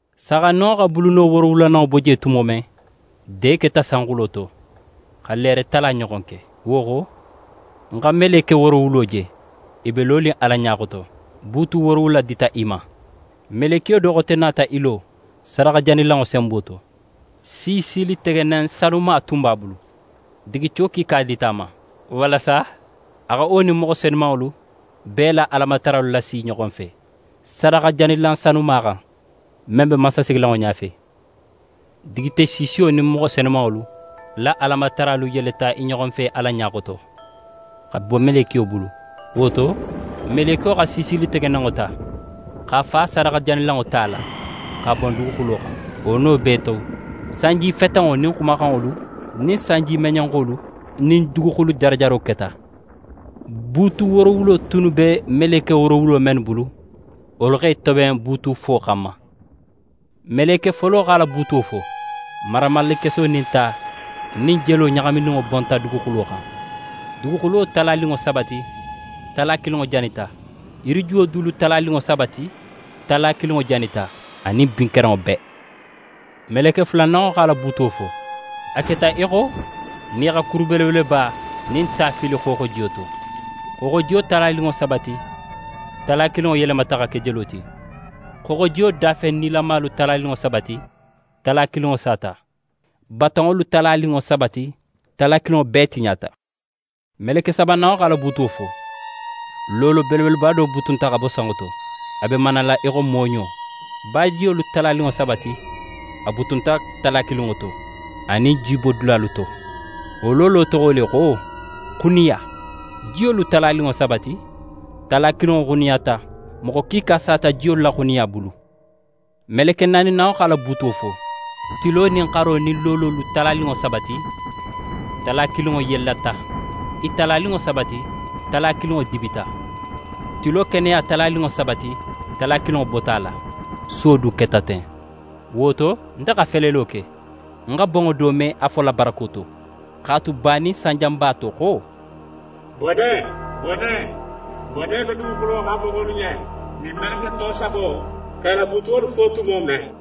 Saaxandinŋo xa buluno woorowulananŋo bo je tumo men, de keta sanxulo to xa leere tala ɲoxon ke. Wo xo, ń xa meleke woorowulo je, i be lonin Ala ɲa xoto. Buutu woorowula dita i ma. Melekiyo do xote nata í lo sadaxajanilanŋo senbo to, siisilitegenen sanuma tun b'a bulu. Digico kiika dita a ma, walasa a xa wo nin moxo senumanŋolu bee la Alamataralu lasi i ɲoxo fe, sadaxajanilan sanuma xan, men be mansasigilanŋo ɲafe. Digice siisiyo nin moxo senumanŋolu la Alamataralu yeleta i ɲoxo fe Ala ɲa xoto, xa bo melekiyo bulu. Wo to, melekiyo xa siisilitegenenŋo ta x'a fa sadaxajanilanŋo ta la, x'a bon duguxulo xan. Wo no bee to, sanjifetenŋo nin xumaxanŋolu nin sanjimeɲenxolu nin duguxulu jarajaro keta. Buutu woorowulo tunnu be meleke woorowulo mennu bulu, wolu x'e toben buutufo xanma. Meleke folo x'a la buutuwo fo. Maramallekeso nin ta nin jelo ɲaxamininŋo bonta duguxulo xan. Duguxulo talaninŋo saba ti, tala kilinŋo janita, yirijuwolu dulu talaninŋo saba ti, tala kilinŋo janita anin bin kerenŋo bee. Meleke fulananŋo x'a la buutuwo fo. A keta í xo nin í xa kuru belebeleba nin ta fili xooxojiyo to. Xooxojiyo talaninŋo saba ti, tala kilinŋo yelemata xa ke jelo ti. Xooxojiyo dafen nilamalu talaninŋo saba ti, tala kilinŋo sata, batonŋolu talaninŋo saba ti, tala kilinŋo bee tiɲata. Meleke sabananŋo x'a la buutuwo fo. Loolo belebeleba do butunta xa bo sanŋo to, a be manala í xo mooɲo. Bajiyolu talaninŋo saba ti, a butunta tala kilinŋo to anin jibodulalu to. Wo loolo toxo le xo: «Xuniya». Jiyolu talaninŋo saba ti, tala kilinŋo xuniyata, moxo kiika sata jiyolu la xuniya bulu. Meleke naaninanŋo x'a la buutuwo fo. Tilo nin xaro nin loololu talaninŋo saba ti, tala kilinŋo yellata. I talaninŋo saba ti, tala kilinŋo dibita. Tilo keneya talaninŋo saba ti, tala kilinŋo bota a la, suwo du keta ten. Wo to, nte xa felelo ke, ń xa bonŋo do me a fola barako to, x'a tu banin sanjanba to xo: «Bone! Bone! Bone be duguxulo xan moxolu ɲen, nin meleke to sabo x'e la buutuwolu fo tumo men!»